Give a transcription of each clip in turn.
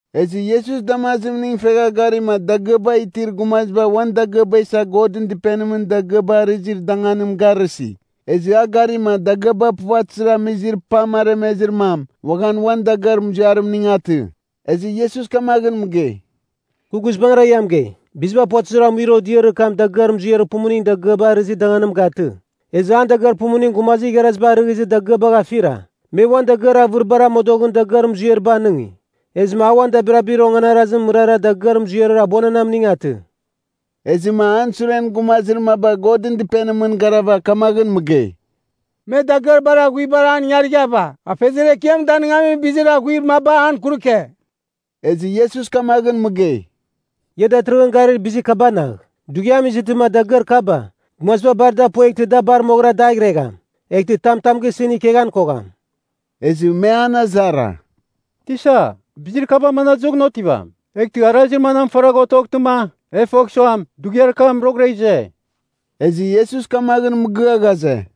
Ezɨ Iesus damazimning fegha garima dagɨaba itir gumaziba uan dagɨaba isa Godɨn Dɨpenimɨn dagɨaba arɨzir danganim garɨsi. Ezɨ a garima dagɨaba puvatɨzir amizir pam aremezir mam uaghan uan dagɨar muziarimning, atɨ. Ezɨ Iesus kamaghɨn mɨgei, “Kɨ guizbangɨra ia mɨgei, biziba puvatɨzir amuir odiarir kam dagɨar muziarir pumuning dagɨaba arɨzir danganim gatɨ, ezɨ an dagɨar pumuning gumazir igharaziba arɨghɨzir dagɨabagh afira. Me uan dagɨar avɨribar amodoghɨn dagɨar muziariba anɨngi. Ezɨma a uan dabirabir onganarazimɨn mɨrara dagɨar muziarir abuananamning atɨ.” Ezɨma an suren gumazir maba Godɨn Dɨpenimɨn garava kamaghɨn mɨgei, “Me dagɨar bar aghuibar an ingarighava, Afeziar Ekiam danɨngamin bizir aghuir maba an kuruke.” Ezɨ Iesus kamaghɨn mɨgei, “Ia datɨrɨghɨn garir bizir kabanagh, dughiam izɨtɨma dagɨar kaba, gumaziba bar da pueghtɨ da bar moghɨra daghregham. Eghtɨ tam tam gisɨn ikeghan kogham.” Ezɨ me an azara, “Tisa, bizir kaba manadɨzoghɨn otivam? Eghtɨ arazir manam faragh otoghtɨma, e fogh suam, dughiar kam roghɨra ize?” Ezɨ Iesus kamaghɨn mɨgɨa ghaze,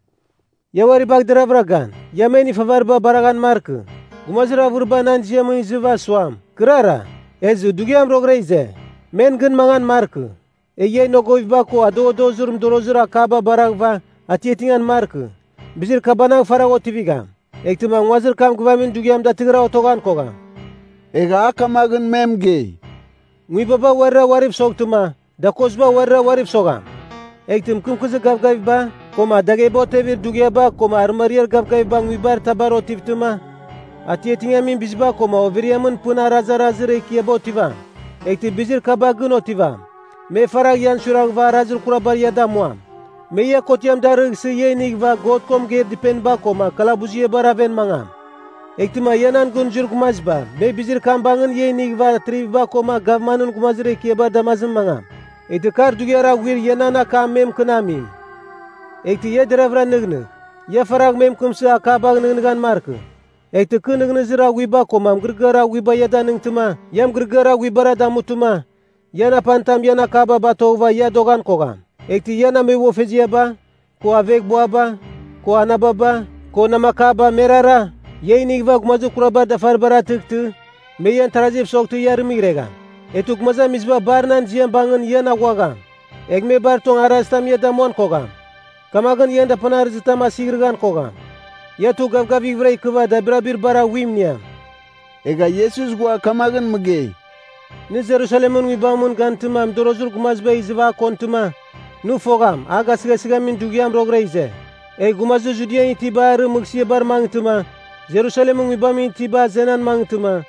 “Ia uari bagh deraghvɨra gan, ia men ifavariba baraghan markɨ. Gumazir avɨriba nan ziamɨn izɨva suam, ‘Kɨrara!’ ezɨ, ‘Dughiam roghɨra ize!’ Men gɨn mangan markɨ. Egh ia inogoviba ko adoghadozir mɨdorozir akaba baraghɨva, atiatingan markɨ. Bizir kabanagh faragh otivigham, eghtɨma nguazir kam gɨvamin dughiam datɨrɨghɨra otoghan kogham.” Egha a kamaghɨn me mɨgei, “Nguibaba uarira uariv soghtɨma, dakoziba uarira uariv sogham. Eghtɨ mɨkɨmkɨzir gavgaviba, koma dagheba otevir dughiaba koma arɨmariar gavgaviba nguibar tabar otivtɨma, atiatingamin biziba koma overiamɨn pɨn arazarazir ekiaba otivam. “Eghtɨ bizir kaba gɨn otivam, me faragh ian suiraghɨva arazir kurabar ia damuam. Me ia kotiam darɨghsɨ ia inighɨva God ko mɨgeir dɨpeniba koma kalabuziabar aven mangam. Eghtɨma ia nan gɨn zuir gumaziba me bizir kam bangɨn ia inighɨva atriviba koma gavmanɨn gumazir ekiabar damazimɨn mangam. Eghtɨ kar dughiar aghuir ia nan akam me mɨkɨnamim. Eghtɨ ia deraghvɨra nɨghnɨgh. Ia faragh me mɨkɨmsɨ akabagh nɨghnɨghan markɨ. Eghtɨ kɨ nɨghnɨzir aghuiba koma mɨgɨrɨgɨar aghuiba ia danɨngtɨma, ia mɨgɨrɨgɨar aghuibara damutɨma, ian apanitam ian akaba batoghɨva ia adoghan kogham. “Eghtɨ ian ameboghfeziaba, ko aveghbuaba, ko anababa, ko namakaba merara, ia inighɨva gumazir kurabar dafaribar atɨghtɨ, me ian taraziv soghtɨ ia arɨmɨghregham. Eghtɨ gumazamiziba bar nan ziam bangɨn ian aghuagham. Egh me bar tong arazitam ia damuan kogham. Kamaghɨn ian dapanarɨzitam asighɨran kogham. Ia tugh gavgavighvɨra ikɨva, dabirabir bar aghuim iniam.” Egha Iesus ghua kamaghɨn mɨgei, “Nɨ Jerusalemɨn nguibamɨn gantɨma mɨdorozir gumaziba izɨva a kontɨma, nɨ fogham a gasɨghasɨghamɨn dughiam roghɨra ize. Egh gumazir Judian itiba arɨ mɨghsɨabar mangɨtɨma, Jerusalemɨn nguibamɨn itiba azenan mangɨtɨma,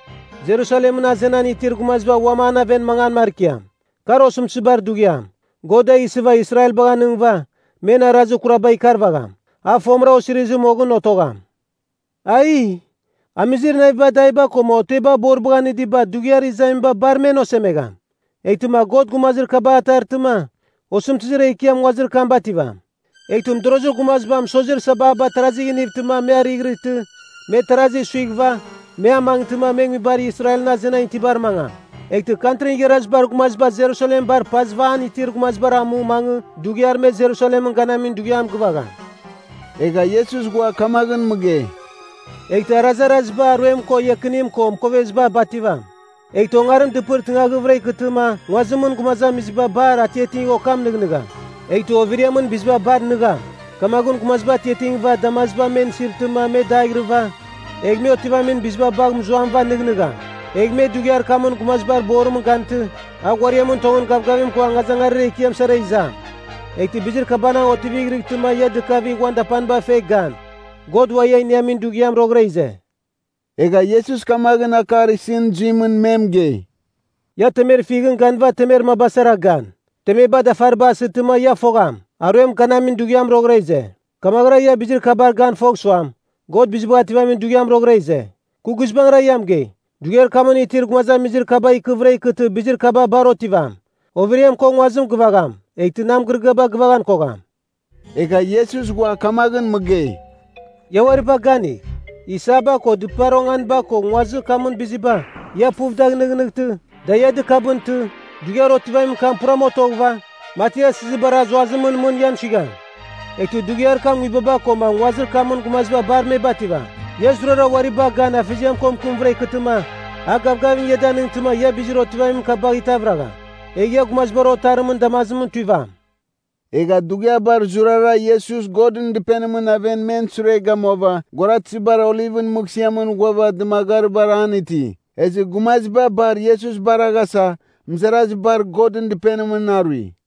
Jerusalemɨn azenan itir gumaziba uam an aven mangan markiam. Kar osɨmtɨzibar dughiam, God da isɨva Israelbar anɨngɨva, men arazir kuraba ikarvagham. A fomɨra osirizir moghɨn otogham. Aiee! Amizir naviba adaiba koma oteba boribagh anɨdiba dughiar izamiba bar men osemegham! Eghtɨma God gumazir kabar atartɨma, osɨmtɨzir ekiam nguazir kam bativam. Eghtɨ mɨdorozir gumaziba mɨsozir sababar tarazigh inivtɨma me arighɨrɨtɨ, me tarazi suighɨva, me amangtɨma me nguibar Israelɨn azenan itibar mangam. Eghtɨ Kantrin Igharazibar Gumaziba Jerusalem bar pazɨva an itir bizibar amu mangɨ dughiar me Jerusalemɨn ganamin dughiam gɨvagham.” Egha Iesus ghua kamaghɨn mɨgei, “Eghtɨ arazaraziba aruem ko iakinim ko mɨkoveziba bativam. Eghtɨ ongarim dɨpɨr tɨngaghɨvɨra ikɨtɨma nguazimɨn gumazamiziba bar atiatigh okam nɨghnɨgham. Eghtɨ overiamɨn biziba bar nɨgham, kamaghɨn gumaziba atiatingɨva damaziba men isirtɨma me daighirɨva, egh me otivamin biziba bagh mɨzuamɨva nɨghnɨgham. Egh me dughiar kamɨn Gumazibar Borimɨn gantɨ, a ghuariamɨn tongɨn gavgavim ko angazangarir ekiam sara izam. Eghtɨ bizir kabanagh otivighrɨtɨma ia dɨkavigh, uan dapaniba fegh gan! God ua ia iniamin dughiam roghɨra ize!” Egha Iesus kamaghɨn akar isɨn zuimɨn me mɨgei, “Ia temer fighɨn ganɨva temer maba sara gan. Temeba dafariba asitɨma ia fogham, aruem ganamin dughiam roghɨra ize. Kamaghɨra ia bizir kabar gan fogh suam, God Bizibagh Ativamin Dughiam roghɨra ize. “Kɨ guizbangɨra ia mɨgei dughiar kamɨn itir gumazamizir kaba ikɨvɨra ikɨtɨ bizir kaba bar otivam. Overiam ko nguazim gɨvagham, eghtɨ nan mɨgɨrɨgɨaba gɨvaghan kogham.” Egha Iesus ghua kamaghɨn mɨgei, “Ia uari bagh ganigh! Isaba ko, dɨpar onganiba ko nguazir kamɨn biziba, ia puv dagh nɨghnɨghtɨ, da ia dɨkabɨntɨ, dughiar otivamin kam puram otoghɨva, mati asɨzibar azuazimɨn mɨn ian suigham. Eghtɨ dughiar kam nguibaba koma nguazir kamɨn gumaziba bar me bativam. Ia zurara uari bagh gan Afeziam ko mɨkɨmvɨra ikɨtɨma, a gavgavim ia danɨngtɨma ia bizir otivamin kabagh itavragham. Egh ia Gumazibar Otarimɨn damazimɨn tuivam.” Egha dughiabar zurara Iesus, Godɨn Dɨpenimɨn aven men sure gamuava, guaratɨzibar Olivɨn mɨghsɨamɨn ghuava dɨmagaribar an iti. Ezɨ gumaziba bar Iesus baraghasa, mɨzarazibar Godɨn Dɨpenimɨn arui.